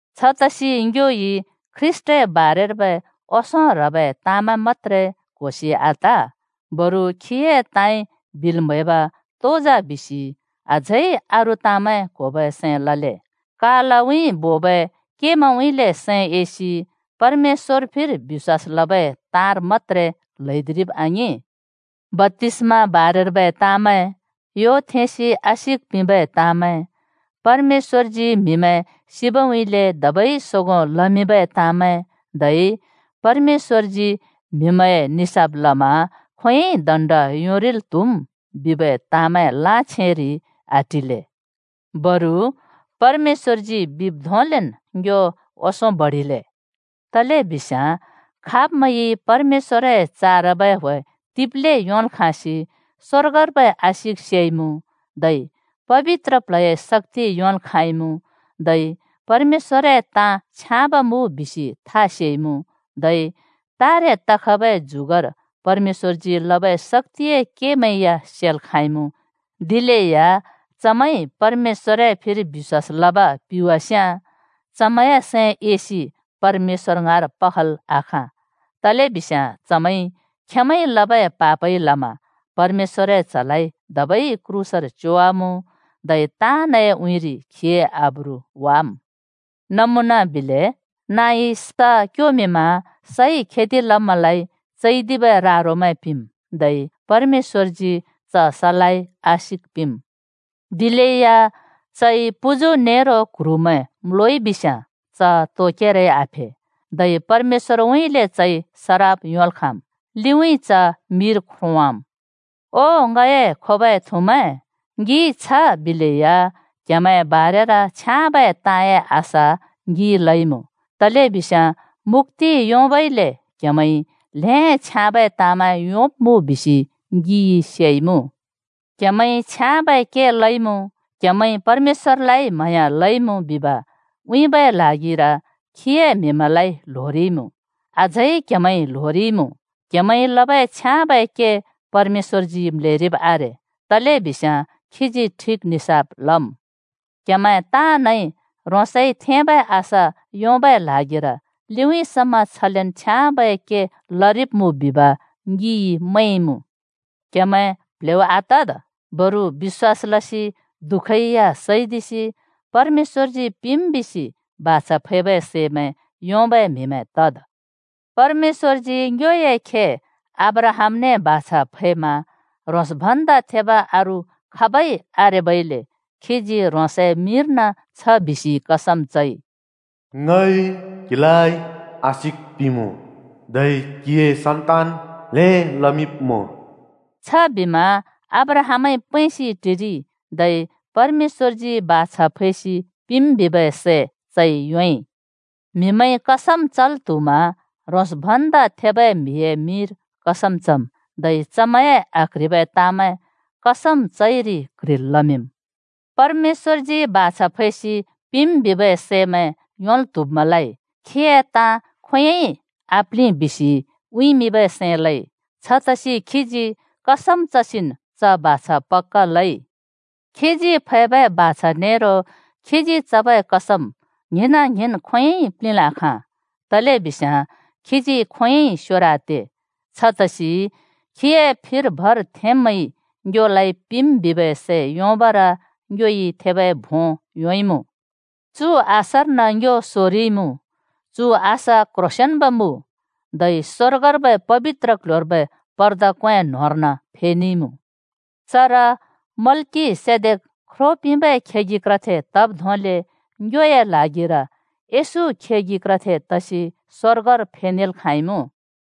छतसि ङ्योइ ख्रीष्‍टए बारेर्बै ओंसों ह्रबै ताँमैं मत्‍त्रे क्होसि आत। बरु खीए ताँइ बिल् म्हैब तो जा बिसि अझै अरू ताँमैं क्होबै सैं लले, कालउँइँ बोबै केमैंउँइँले सैं एसि परमेश्‍वर फिर बिश्‍वास लबै ताँर मत्‍त्रे ल्हैदिरिब् आङिं, बप्‍तिस्मा बारेर्बै ताँमैं, यो थेंसि आशिक पिंबै ताँमैं, परमेश्‍वरजी म्हिमैं सिबउँइँले धबै सोगों लमिंबै ताँमैं धै परमेश्‍वरजी म्हिमैंए निसाफ लमा खोंयोंइ दण्ड योंरिल् त्हुम् बिबै ताँमैं लाछेंरि आटिले। बरु परमेश्‍वरजी बिब् धोंलेन् ङ्यो ओंसों बडिले। तलेबिस्याँ खाब्मैंइ परमेश्‍वरए चारबै ह्‍वे तिब्ले योंल् खाँसि स्वर्गर्बै आशिक सेइमुँ, धै पबित्र प्ल्हए शक्‍ति योंल् खाँइमुँ, धै परमेश्‍वरए ताँ छ्याँब मुँ बिसि था सेइमुँ, धै तारे तखबै जुगर परमेश्‍वरजी लबै शक्‍तिए केमैं या सेल् खाँइमुँ, दिलेया चमैंइ परमेश्‍वरए फिर बिश्‍वास लब पिवास्याँ, चमैंए सैं एसि परमेश्‍वर ङाँर पखल् आखाँ! तलेबिस्याँ चमैंइ खेंमैंइ लबै पापइ लमा परमेश्‍वरए च्‍हलाइ धबै क्रूसर च्योवामुँ, धै ताँनए उँइँरि खीए आब्रु वाम्। नमुना बिले: नाँइ स क्योमिंमा सइ खेति लब्मैंलाइ चैदिबै रा-रोमैं पिंम्, धै परमेश्‍वरजी च सलाइ आशिक पिंम्। दिलेया चइ पुजु नेरो क्ह्रुमैं म्‍लोइ बिस्याँ च तो केरै आफे, धै परमेश्‍वरउँइँले चइ सराप योंल् खाँम्। लिउँइँ च मिर ख्रोंवाम्। ओ ङए खोबै थुमैं, ङिइ छ बिलेया क्‍हेमैंए बारेर छ्याँबै ताँए आशा ङिइ लइमुँ। तलेबिस्याँ मुक्‍ति योंबइले क्हेमैंइ ल्हें छ्याँबै ताँमैं योंब्मुँ बिसि ङिइ सेइमुँ। क्‍हेमैंइ छ्याँबै के लइमुँ, क्‍हेमैंइ परमेश्‍वरलाइ म्हाँया लइमुँ बिब उँइँबै ल्हागिर खीए म्‍हिमैंलाइ ल्होरिइमुँ, अझै क्‍हेमैंइ ल्होरिमुँ। क्‍हेमैंइ लबै छ्याँबै के परमेश्‍वरजी म्‍लेरिब् आरे, तलेबिस्याँ खीजी ठिक निसाफ लम्। क्‍हेमैं ताँनइ ह्रोंसइ थेंबै आशा योंबै ल्हागिर लिउँइँ समा छलेन् छ्याँबै के लरिब्मुँ बिब ङिइ मैंमुँ। क्‍हेमैं प्ल्हेउ आतद्, बरु बिश्‍वास लसि दुःखै या सैदिसि परमेश्‍वरजी पिंम् बिसि बाछा फैबै सैमैं योंबै म्हिमैं तद्। परमेश्‍वरजी ङ्योए खे अब्राहामने बाछा फैमा ह्रोंस भन्दा थेब अरू खाबै आरेबइले खीजी ह्रोंसए मिंर्न छ बिसि कसम चइ, “ङइ क्‍हिलाइ आशिक पिंमुँ, धै क्‍हिए सन्‍तान ल्हें लमिंब्‍मुँ।” छबिमा अब्राहामइ पैंसि टिरिइ, धै परमेश्‍वरजी बाछा फैसि पिंम् बिबै सै चइ योंइ। म्हिमैंइ कसम चल् त्हुमा ह्रोंस् भन्दा थेबै म्हिए मिंर कसम चम्। धै चमैंए आक्ह्रिबै ताँमैं कसम चइरि क्ह्रिल् लमिंम्। परमेश्‍वरजी बाछा फैसि पिंम् बिबै सैमैं योंल् त्‍हुब्‍मैंलाइ “खीए ताँ खोंयोंइ आप्लिं,” बिसि उँइँमिंबै सैं लइ। छतसि खीजी कसम चसिन् च बाछा पक्‍का लइ। खीजी फैबै बाछा नेरो खीजी चबै कसम ङ्हिंना ङ्हिंन् खोंयोंइ प्लिंल् आखाँ, तलेबिस्याँ खीजी खोंयोंइ स्‍योर आते। छतसि खीए फिर भर थेंब्‍मैंइ ङ्योलाइ पिंम् बिबै सै योंबर ङ्योइ थेबै भों योंइमुँ। चु आशार्न ङ्यो सोरिइमुँ। चु आशा क्ह्रोंसेंन्बै मुँ, धै स्‍वर्गर्बै पबित्र क्‍ल्‍ह्‍योर्बै पर्दा क्‍वें न्‍होंर्न फेनेइमुँ। चर मल्‍किसेदेक ख्रो पिंबै खेगि क्रथे तब् धोंले ङ्योए ल्हागिर येशू खेगि क्रथे तसि स्वर्गर फेनेल् खाँइमुँ।